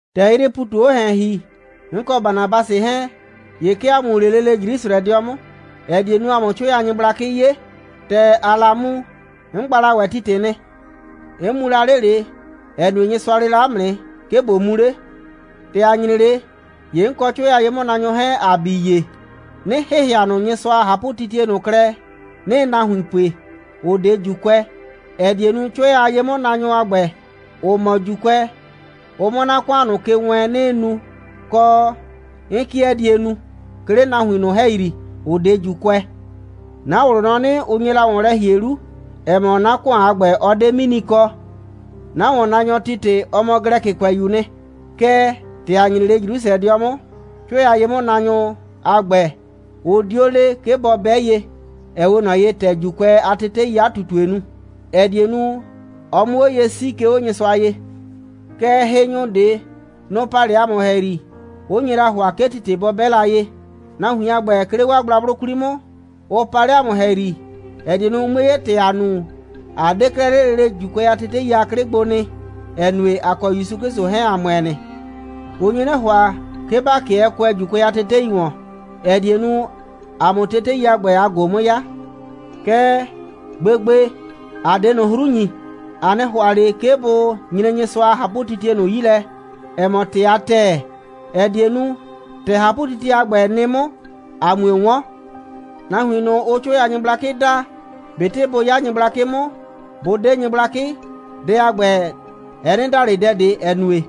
‑Tɛ 'yrɩɩ ‑pu ꞊tu 'o ‑hɛn ‑hi, 'n kɔ Banabasɩ 'hɛɛn, ‑ye 'ke ‑a mu 'le lele Jrusrɛdɩɔ 'mʋ, ‑ɛ die nu, ‑a 'mʋ 'cʋɛ a nyɩgblakɩ 'ye. ‑Tɛ ‑aa la mu, 'n gba la ‑wɛ Titɩ nɩ. 'N mu la 'le ꞊le, ‑ɛ nue, Nyɩsʋa le la 'mʋ nɩ, 'ke ꞊bo mu 'le. ‑Tɛ ‑a nyre 'le, ‑ye 'n kɔ 'cʋɛ a ye'mʋnaanyʋ 'hɛɛn, ‑a bii ye, 'nɩ ‑hɩhɩa ꞊nʋ Nyɩsʋa a ꞊hapʋtitie ꞊nʋ klɛ, 'nɩɩ nahuin ꞊nʋ pue, ‑ʋ 'de ‑Juukʋɛ, ‑ɛ die nu, 'cʋɛ a ye'mʋnaanyʋ a ‑gbɛ, ‑ʋ mɔ ‑Juukʋɛ, ʋ 'mʋ 'na ‑kʋan ꞊nʋ ke wɛɛn, 'nɩɩ nu, kɔ, 'n 'kɩɛ die nu, 'ke 'le nahuin ꞊nʋ ‑hɛyri, ‑ʋ 'de ‑Juukʋɛ. 'Na ꞊wlʋ nɔ 'nɩ, ʋ nye la ‑wɔn lɛ ‑hie 'lu, ‑ɛ mɔ, 'na ‑kʋan a ‑gbɛ, ɔ 'de 'mini kɔ. 'Na ‑wɔnnaanyɔ Titɩ, ɔ mɔ Glɛkɩkʋɛyu'u nɩ. Kɛɛ, ‑tɛ ‑a nyre 'le Jrusrɛdɩɔ 'mʋ, 'cʋɛ a ye'mʋnaanyʋ a ‑gbɛ, ʋ 'dio le, 'ke bɔ 'bɛ ye, ‑ɛ 'we ꞊nɔ ye, ‑tɛ ‑Juukʋɛ a teteii 'a ꞊tutue nu, ‑ɛ die nu, ɔ 'mʋ 'o ye 'sii, 'ke 'o Nyɩsʋa ye. Kɛɛ, hɩnyʋ ꞊de, nʋ‑ pa 'le ‑a mʋ ‑hɛyri, 'ʋ nye la ‑hʋa, 'ke Titɩ a ‑gbɛ bɔ 'bɛ ye. Nahuin a ‑gbɛ, 'ke 'le gblagblʋ 'kwli 'mʋʋ nɩ, ʋ pa 'le ‑a mʋ ‑hɛyri, ‑ɛ die nu, ʋ 'mue 'ye, ‑tɛ ‑aa nu, ꞊a 'de 'klɛɛ 'le lele ‑Juukʋɛ a tetei a 'klɩ gbo nɩ, ‑ɛ nue, ‑a kɔ ‑Yusu 'Klɩsʋ 'hɛɛn, ‑a ‑mʋɛ nɩ. Ʋ nye 'nɩ ‑hʋa, 'ke ‑ba 'kɩɛ kʋɛ ‑Juukʋɛ a tetei ‑wɔn, ‑ɛ die nu, ‑a 'mʋ tetei a ‑gbɛ a ꞊go 'mʋ 'ya. Kɛɛ, gbegbe, ‑a 'de ꞊nʋ 'hru ‑nyi. ‑A 'nɩ ‑hʋa ꞊le 'ke bʋ nyre Nyɩsʋa a ꞊hapʋtitie ꞊nʋ 'yi lɛ, ‑ɛ mɔ ‑tɩ a ‑tɛɛ, ‑ɛ die nu, ‑tɛ ꞊hapʋtitie a ‑gbɛ nɩ 'mʋ, a 'mue 'wɔn. Nahuin ꞊nʋ, ʋʋ 'cʋɛ a nyɩgblakɩ daa, ꞊betɩ bʋ 'ya nyɩgblakɩ 'mʋ, bʋ 'de nyɩgblakɩ, dɛ a ‑gbɛ, ɛ 'nɩ da ꞊le dɛ ꞊de, ‑ɛ nue,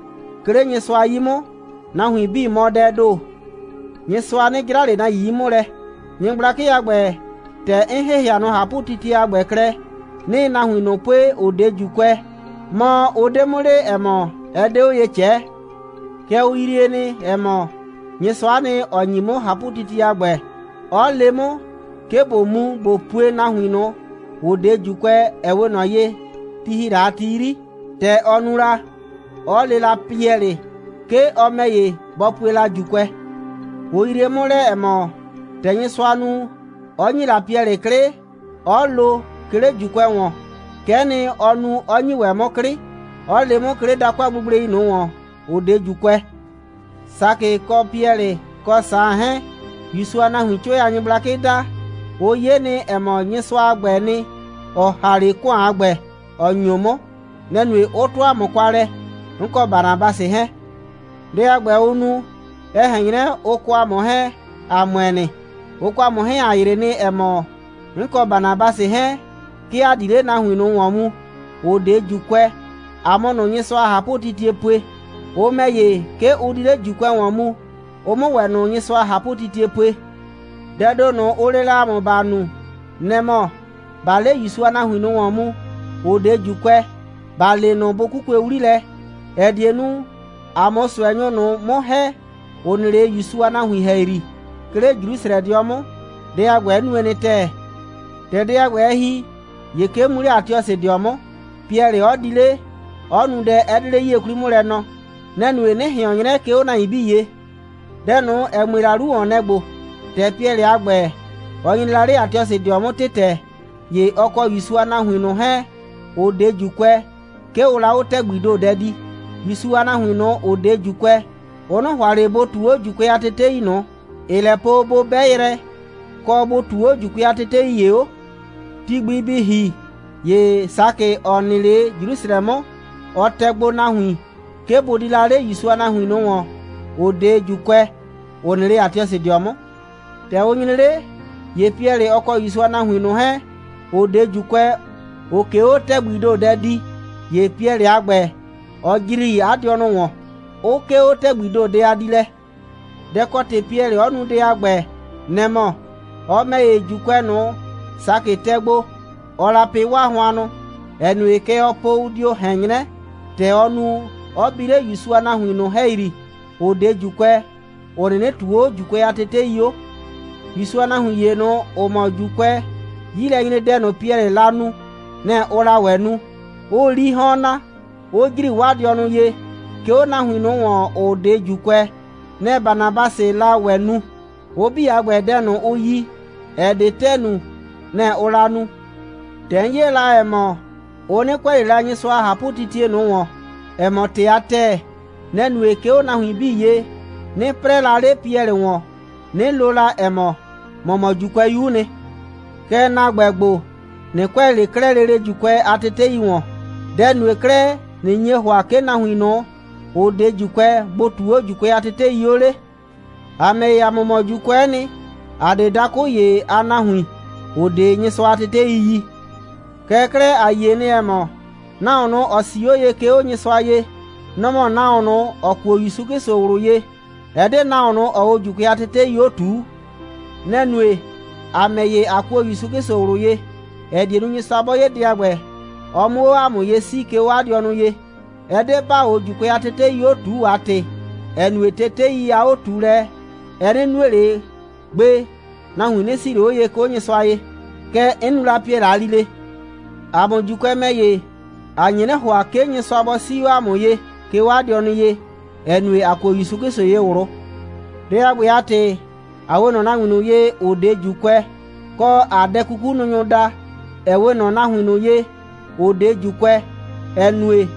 'ke 'le Nyɩsʋa 'yi 'mʋ, nahuin 'bii mɔ dɛɛ ‑do. Nyɩsʋa 'nɩ 'jra ꞊le nahuin 'yi 'mʋ lɛ. Nyɩgblakɩ a ‑gbɛ, ‑tɛ 'n ‑hɩhɩa ꞊nʋ ꞊hapʋtitie a ‑gbɛ klɛ, 'nɩɩ nahuin ꞊nʋ pue, ‑ʋ 'de ‑Juukʋɛ, mɔ, ʋ 'de 'mʋ le, ‑ɛ mɔ, ɛ 'de 'o ye ꞊cɛɛ. Kɛɛ, ʋ yrie nɩ, ‑ɛ mɔ, Nyɩsʋa'a nɩ, ‑ɔ ‑nyi 'mʋ ꞊hapʋtitie a ‑gbɛ, 'ɔ le 'mʋ, 'ke ꞊bo mu, ꞊bo pue nahuin ꞊nʋ, ‑ʋ 'de ‑Juukʋɛ, ‑ɛ 'we ꞊nɔ ye, ti ‑hi la a ti 'yri, ‑tɛ ɔ nu la, 'ɔ le la Piɛlɩ, 'ke ɔ ‑mɛ ‑ye, bɔ pue la ‑Juukʋɛ. Ʋ yrie 'mʋ lɛ, ‑ɛ mɔ, ‑tɛ Nyɩsʋa nu, 'ɔ ‑nyi la Piɛlɩ 'klɩ, 'ɔ lo, 'ke 'le ‑Juukʋɛ ‑wɔn, kɛ'ɛ nɩ, ɔ nu, 'ɔ ‑nyi ‑wɛ 'mʋ 'klɩ, 'ɔ le 'mʋ, 'ke 'le dakʋ a gblegblei ꞊nʋ ‑wɔn, ‑ʋ 'de ‑Juukʋɛ. Sakɩ kɔ Piɛlɩ kɔ Saan 'hɛɛn, ‑Yusu a nahuiin 'cʋɛ a nyɩgblakɩ daa, ʋ 'ye nɩ, ‑ɛ mɔ, Nyɩsʋa a ‑gbɛɛ nɩ, ‑ɔ ‑ha 'le ‑kʋan a ‑gbɛ, 'ɔ ‑nyo 'mʋ. Nɛ‑ nue, 'ʋ 'tʋ ‑a mʋ kwa lɛ, 'n kɔ Banabasɩ 'hɛɛn. Dɛ a ‑gbɛ, ʋ nu, ɛ ꞊hɛn 'nyrɛ, ʋ kɔ ‑a mʋ 'hɛɛn, ‑a ‑mʋɛ nɩ. Ʋ kɔ ‑a mʋ 'hɛɛn, ‑a ‑yrɩ nɩ, ‑ɛ mɔ, 'n kɔ Banabasɩ 'hɛɛn, 'ke ‑a di 'le nahuin ꞊nʋ ‑wɔn mu, ‑ʋ 'de ‑Juukʋɛ, ‑a 'mʋ ꞊nʋ Nyɩsʋa a ꞊hapʋtitie pue. Ʋ ‑mɛ ‑ye, 'ke ʋ di 'le ‑Juukʋɛ ‑wɔn mu, ʋ 'mʋ ‑wɛ ꞊nʋ Nyɩsʋa a ꞊hapʋtitie pue. Dɛɛ ‑do ꞊nʋ, ʋ le la ‑a mʋ, ‑ba nu, nɛ‑ mɔ: ꞊Baa 'le ‑Yusu a nahuin ꞊nʋ ‑wɔn mu, ‑ʋ 'de ‑Juukʋɛ, ‑ba le ꞊nʋ, bʋ 'kukue 'wli lɛ, ‑ɛ die nu, ‑a 'mʋ ꞊sʋɛnyʋ ꞊nʋ 'mʋ ‑hɛ, ‑ʋ nɩ 'le ‑Yusu a nahuin ‑hɛyri, 'ke 'le Jrusrɛdɩɔ 'mʋ. Dɛ a ‑gbɛ, 'n nue nɩ ‑tɛɛ. ‑Tɛ dɛ a ‑gbɛ, ɛ ‑hi, ‑ye 'ke 'n mu 'le Atiɔsɩdɩɔ 'mʋ, Piɛlɩ 'ɔ di 'le, 'ɔ nu dɛ, ‑ɛ 'de 'le 'yie 'kwli 'mʋ lɛ nɔɔ. Nɛ‑ nue, 'nɩ ꞊hɩɔn 'nyrɛ, 'ke 'o nahuin 'bii ye. Dɛ ꞊nʋ, ‑ɛ mue la 'lu ‑wɔn, nɛ‑ ‑gbo: ‑Tɛ Piɛlɩ a ‑gbɛ, ɔ nyre la 'le Atiɔsɩdɩɔ 'mʋ ‑tɩtɛ, ‑ye ɔ kɔ ‑Yusu a nahuin ꞊nʋ 'hɛɛn, ‑ʋ 'de ‑Juukʋɛ, 'ke ʋʋ la 'o ‑tɛgbii ‑do dɛ dii. (‑Yusu a nahuin ꞊nʋ, ‑ʋ 'de ‑Juukʋɛ, ʋ 'nɩ ‑hʋa ꞊le bʋ ꞊tuu 'o ‑Juukʋɛ a tetei ꞊nʋ, ‑ɩɩ lɛ po, bʋ 'bɛ yrɛ, kɔ, bʋ ꞊tuu 'o ‑Juukʋɛ a tetei ‑ye 'o.) Ti gbi bɩ ‑hi, ‑ye Sakɩ, ‑ɔ nɩ 'le Jrusrɛdɩɔ 'mʋ, ɔ tɛ gbo nahuin, 'ke bʋ di la 'le ‑Yusu a nahuin ꞊nʋ ‑wɔn, ‑ʋ 'de ‑Juukʋɛ, ‑ʋ nɩ 'le Atiɔsɩdɩɔ 'mʋ. ‑Tɛ ʋ nyre 'le, ‑ye Piɛlɩ, ‑ɔ kɔ ‑Yusu a nahuin ꞊nʋ 'hɛɛn, ‑ʋ 'de ‑Juukʋɛ, ‑ʋʋ ꞊ke 'o ‑tɛgbii ‑do dɛ dii, ‑ye Piɛlɩ a ‑gbɛ, ɔ ‑jri 'a dɩɔnʋ ‑wɔn, 'ʋ 'kee 'o ‑tɛgbii ‑do dɛ a diilɛ. Dɛ ‑kɔ ‑tɩ Piɛlɩ 'ɔ nu dɛ a ‑gbɛ, nɛ‑ mɔ: Ɔ ‑mɛ ‑ye, ‑Juukʋɛ ꞊nʋ, Sakɩ tɛ gbo, ɔɔ la pɩ 'waa hʋannʋ, ‑ɛ nue, kɛ ɔɔ po, ʋ dio ꞊hɛn 'nyrɛ, ‑tɛ ɔ nu, 'ɔ bi 'le ‑Yusu a nahuin ꞊nʋ ‑hɛyri, ‑ʋ 'de ‑Juukʋɛ, ‑ʋ 'nɩnɩ ꞊tuu 'o ‑Juukʋɛ a tetei 'o. ‑Yusu a nahuin ‑ye ꞊nʋ, ‑ʋ mɔ ‑Juukʋɛ, 'yilɛnyredɛ ꞊nʋ, Piɛlɩɩ la nu, nɛ‑ ʋʋ la ‑wɛ nu, 'ʋʋ 'lii 'hɔn na, 'ʋ ‑jri 'waa dɩɔnʋ ye, 'ke 'o nahuin ꞊nʋ ‑wɔn, ‑ʋ 'de ‑Juukʋɛ. Nɛ‑ Banabasɩɩ la ‑wɛ nu. Ʋ 'bii a ‑gbɛ, dɛ ꞊nʋ, ʋ yi, ‑ɛ 'de ‑tɛɛ nu, nɛ‑ ʋʋ la nu. ‑Tɛ 'n 'ye la, ‑ɛ mɔ, ʋ 'nɩ kʋɛ ꞊le la Nyɩsʋa a ꞊hapʋtitie ꞊nʋ ‑wɔn, ‑ɛ mɔ ‑tɩ a ‑tɛɛ, nɛ‑ nue, 'ke 'o nahuin 'bii ye, 'nɩ 'prɛɛ la 'le Piɛlɩ ‑wɔn, 'nɩ lo la, ‑ɛ mɔ: «‑Mɔ mɔ ‑Juukʋɛyu'u nɩ. Kɛɛ, ‑na ‑gbɛ ‑gbo, ꞊nɩ kʋɛ ꞊le 'klɛɛ lele ‑Juukʋɛ a tetei ‑wɔn. Dɛ‑ nue 'klɛɛ, ꞊nɩ nye ‑hʋa, 'ke nahuin ꞊nʋ, ‑ʋ 'de ‑Juukʋɛ, bʋ ꞊tuu 'o ‑Juukʋɛ a tetei 'o 'le? ‑A ‑mɛ ‑ye, ‑a mʋ mɔ ‑Juukʋɛ'ɛ nɩ, ‑a 'de dakʋ ‑ye a nahuin, ‑ʋ 'de Nyɩsʋa a tetei yi. Kɛɛ 'klɛɛ, ‑a yie nɩ, ‑ɛ mɔ, nahuon ꞊nʋ, ‑ɔ 'sii 'o ye, 'ke 'o Nyɩsʋa ye, nɔ‑ mɔ nahuon ꞊nʋ, ‑ɔ kuo ‑Yusu 'Klɩsʋ ꞊wlʋ ye. Ɛ 'de nahuon ꞊nʋ, ‑ɔɔ 'o ‑Juukʋɛ a tetei 'o ꞊tuu. Nɛ‑ nue, ‑a ‑mɛ ‑ye, ꞊a kuo ‑Yusu 'Klɩsʋ ꞊wlʋ ye, ‑ɛ die nu, Nyɩsʋa 'bɔ 'ye dɛ a ‑gbɛ, ɔ 'mʋ 'o ‑a mʋ ye 'sii, 'ke 'o 'a dɩɔnʋ ye. Ɛ 'de ‑baa 'o ‑Juukʋɛ a tetei 'o ꞊tuu a ‑tɩ, ‑ɛ nue, tetei a 'o꞊tuulɛ, ɛ 'nɩ nue ꞊le gbe, nahuin 'nɩ 'sii ꞊le 'o ye, 'ke 'o Nyɩsʋa ye.» Kɛ 'n nu la Piɛlɩ a lile. ‑A mʋ ‑Juukʋɛ ‑mɛ ‑ye, ‑a nye 'nɩ ‑hʋa, 'ke Nyɩsʋa bɔ 'sii 'o ‑a mʋ ye, 'ke 'o 'a dɩɔnʋ ye, ‑ɛ nue, ‑a kuo ‑Yusu 'Klɩsʋ ye ꞊wlʋ. Dɛ a ‑gbɛ a ‑tɩ, ꞊a 'we ꞊nɔ nahuin ꞊nʋ ye, ‑ʋ 'de ‑Juukʋɛ, kɔ, ‑aa dɛ'kukununyʋ daa, ‑ɛ 'we ꞊nɔ nahuin ꞊nʋ ye, ‑ʋ 'de ‑Juukʋɛ, ‑ɛ nue,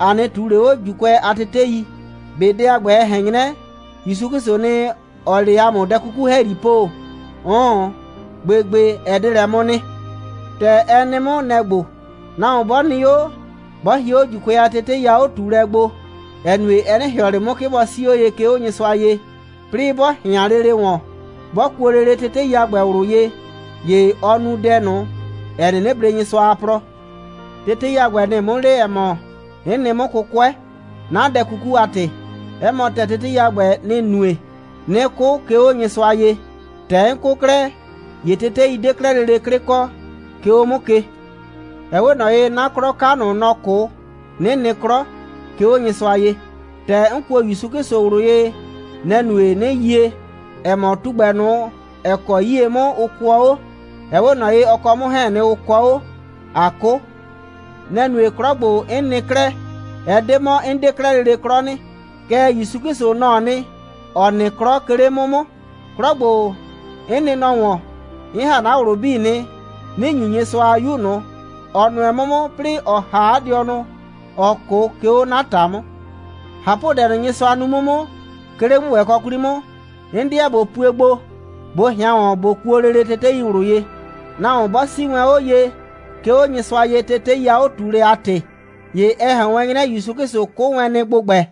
‑a 'nɩ ꞊tuu ꞊le 'o ‑Juukʋɛ a tetei. ꞊Be dɛ a ‑gbɛ, ɛ ꞊hɛn 'nyrɛ, ‑Yusu 'Klɩsʋʋ nɩ, ‑ɔɔ 'le ‑a mʋ dɛ 'kuku ‑hɛyri po? 'Ʋʋn, gbegbe, ɛ 'de lɛ 'mʋ nɩ. ‑Tɛ ɛ nɩ 'mʋ, nɛ‑ ‑gbo: Nahuon 'bɔ nɩ 'o, 'bɔ hie 'o ‑Juukʋɛ a tetei a 'o꞊tuulɛ gbo, ‑ɛ nue, ɛ 'nɩ ‑hɩɔ ꞊le 'mʋ, 'ke bɔ 'sii 'o ye, 'ke 'o Nyɩsʋa ye, 'plɩɩ 'bɔ ꞊hɩan lele ‑wɔn, 'bɔ kuo lele tetei a ‑gbɛ ꞊wlʋ ye, ‑ye ɔɔ nu dɛ ꞊nʋ, ‑ɛ 'nɩnɩ blee Nyɩsʋa a plɔ. Tetei a ‑gbɛ, nɩ‑ɩ 'mʋ le, ‑ɛ mɔ, 'n nɩ 'mʋ 'kʋkʋɛ, 'na dɛ 'kuku a ‑tɩ. 'Ɛ mɔ ‑tɛɛ, tetei a ‑gbɛ, nɩ‑ nue, 'nɩ 'kʋ, 'ke 'o Nyɩsʋa ye. ‑Tɛ 'n 'kʋ 'klɛɛ, ‑ye tetei 'de 'klɛɛ lele 'klɩ kɔ, 'ke 'o 'mʋ ke. Ɛ 'we ꞊nɔ ye, 'na 'klɔ 'ka ꞊nʋ, nɔ‑ 'kʋ, 'nɩ nɩ 'klɔ, 'ke 'o Nyɩsʋa ye. ‑Tɛ 'n kuo ‑Yusu 'Klɩsʋ ꞊wlʋ ye, nɛ‑ nue, 'nɩ yie, ‑ɛ mɔ, tugbɛ ꞊nʋ, ‑ɛ kɔ 'yie 'mʋ ʋ kʋɔ 'o, ɛ 'we ꞊nɔ ye, ɔ kɔ 'mʋ 'hɛɛn‑ nɩ, ʋ kɔɔ 'o, ꞊a 'kʋ. Nɛ‑ nue, 'klɔ ‑gbo, 'n nɩ 'klɛɛ, ɛ 'de 'mɔ, 'n 'de 'klɛɛ lele 'klɔ nɩ, kɛɛ, ‑Yusu 'Klɩsʋ, nɔ‑ɔ nɩ, ‑ɔ nɩ 'klɔ, 'ke 'le 'mʋ 'mʋ. 'Klɔ ‑gbo, 'n nɩ nɔ ‑wɔn, 'n ‑ha 'na ꞊wlʋ 'bii nɩ, 'nɩ ‑nyu Nyɩsʋa a 'Yu ꞊nʋ, ‑ɔ nʋɛ 'mʋ 'mʋ, 'plɩɩ ‑ɔ ‑ha 'a dɩɔnʋ, ‑ɔ 'kʋ, 'ke 'o 'na ‑ta 'mʋ. ꞊Hapʋdɛ ꞊nʋ, Nyɩsʋa nu 'mʋ 'mʋ, 'ke 'le ‑gbʋgbɛkɔ 'kwli 'mʋ, 'n 'deɛ ꞊bo pue gbo, ꞊bo ꞊hɩan ‑wɔn, ꞊bo kuo lele tetei ꞊wlʋ ye. Nahuon 'bɔ 'sii wɛn 'o ye, 'ke 'o Nyɩsʋa ye, tetei a 'o꞊tuulɛ a ‑tɩ, ‑ye ɛ ꞊hɛn wɛn 'nyrɛ, ‑Yusu 'Klɩsʋ 'kʋ wɛn nɩ ‑gbʋgbɛ.